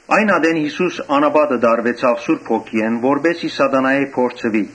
Այն ատեն Յիսուս անապատը տարուեցաւ Սուրբ Հոգիէն, որպէս զի Սատանայէն փորձուի։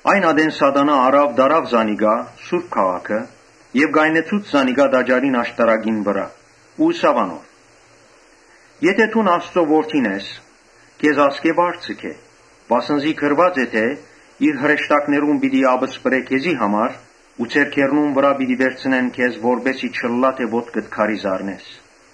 Այն ատեն Սատանան առաւ տարաւ զանիկա սուրբ քաղաքը եւ կայնեցուց զանիկա տաճարին աշտարակին վրայ Ու ըսաւ անոր. «Եթէ դուն Աստուծոյ Որդին ես, քեզ ասկէ վար ձգէ, վասն զի գրուած է թէ Իր հրեշտակներուն պիտի ապսպրէ քեզի համար, որ ձեռքերնուն վրայ վերցնեն քեզ, որպէս զի չըլլայ թէ ոտքդ քարի զարնես»։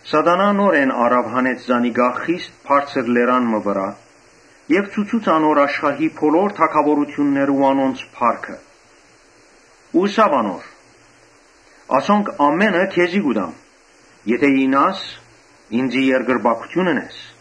Սատանան նորէն առաւ հանեց զանիկա խիստ բարձր լերան մը վրայ եւ ցուցուց անոր աշխարհի բոլոր թագաւորութիւնները ու անոնց փառքը. Ու ըսաւ անոր. «Ասոնք ամէնը քեզի պիտի տամ, եթէ իյնաս՝ ինծի երկրպագութիւն ընես»։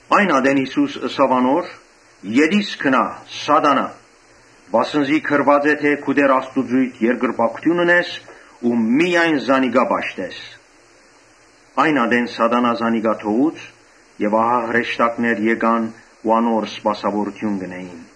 Այն ատեն Յիսուս ըսաւ անոր. «[Ետիս] գնա, Սատանա՛յ, վասն զի գրուած է թէ՝ ‘Քու Տէր Աստուծոյդ երկրպագութիւն ընես ու միայն զանիկա պաշտես’»։ Այն ատեն Սատանան զանիկա թողուց եւ հրեշտակները եկան ու անոր սպասաւորութիւն կ’ընէին։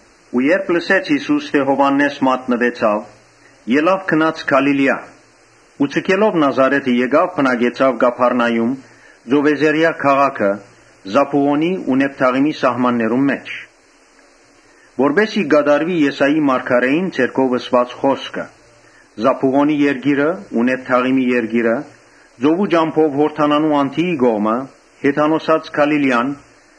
Երբ լսեց Յիսուս թէ Յովհաննէս մատնուեցաւ, ելաւ գնաց Գալիլիա Ու ձգելով Նազարէթը, եկաւ բնակեցաւ Կափառնայում, ծովեզերեայ քաղաքը, Զաբուղոնի ու Նեփթաղիմի սահմաններուն մէջ, Որպէս զի կատարուի Եսայի մարգարէին միջոցով ըսուած խօսքը. «Զաբուղոնի երկիրը ու Նեփթաղիմի երկիրը, ծովու ճամբով Յորդանանի անդիի կողմը, Հեթանոսներու Գալիլիան.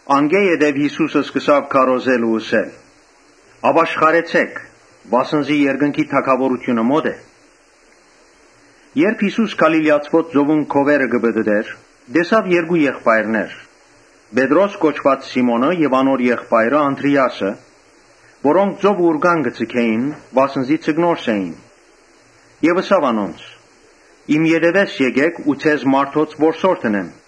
Անկէ յետոյ Յիսուս սկսաւ քարոզել ու ըսել. «Ապաշխարեցէք, վասն զի երկնքի թագաւորութիւնը մօտ է»։ Երբ Յիսուս Գալիլիացիներուն ծովուն քովերը կը պտըտէր, տեսաւ երկու եղբայրներ, Պետրոս կոչուած Սիմոնը եւ անոր եղբայրը Անդրէասը, որոնք ծովը ուռկան կը ձգէին, վասն զի ձկնորս էին։ Ըսաւ անոնց. «Իմ ետեւէս եկէք ու ձեզ մարդոց որսորդ ընեմ»։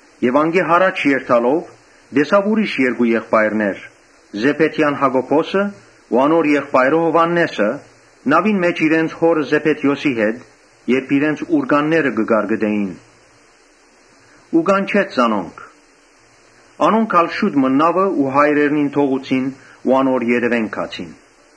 Անկէ յառաջ երթալով՝ տեսաւ ուրիշ երկու եղբայրներ, Զեբեդեան Յակոբոսը ու անոր եղբայրը Յովհաննէսը, նաւին մէջ իրենց հօրը Զեբեդիոսի հետ, իրենց ուռկանները կը կարկտնէին ու կանչեց զանոնք. Անոնք ալ շուտ մը նաւն ու հայրերնին թողուցին ու անոր ետեւէն գացին։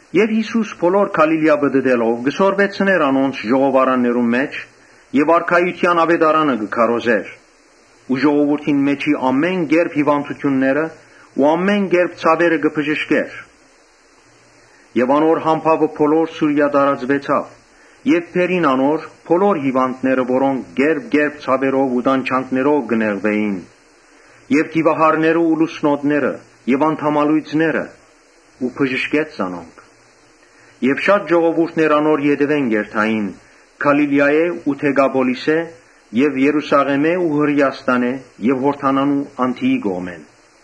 Յիսուս բոլոր Գալիլիա պտըտելով, կը սորվեցնէր անոնց ժողովարաններուն մէջ եւ արքայութեան աւետարանը կը քարոզէր ու ժողովուրդին մէջի ամէն կերպ հիւանդութիւնները ու ամէն կերպ ցաւերը կը բժշկէր։ Անոր համբաւը բոլոր Սուրիա տարածուեցաւ եւ բերին անոր՝ բոլոր հիւանդները, որոնք կերպ կերպ ցաւերով ու տանջանքներով կը նեղուէին եւ դիւահարներ ու լուսնոտներ եւ անդամալոյծներ ու բժշկեց զանոնք։ Եւ շատ ժողովուրդներ անոր ետեւէն կ’երթային, Գալիլիայէն ու Դեկապոլիսէն եւ Երուսաղէմէն ու Հրէաստանէն եւ Յորդանանի անդիի կողմէն։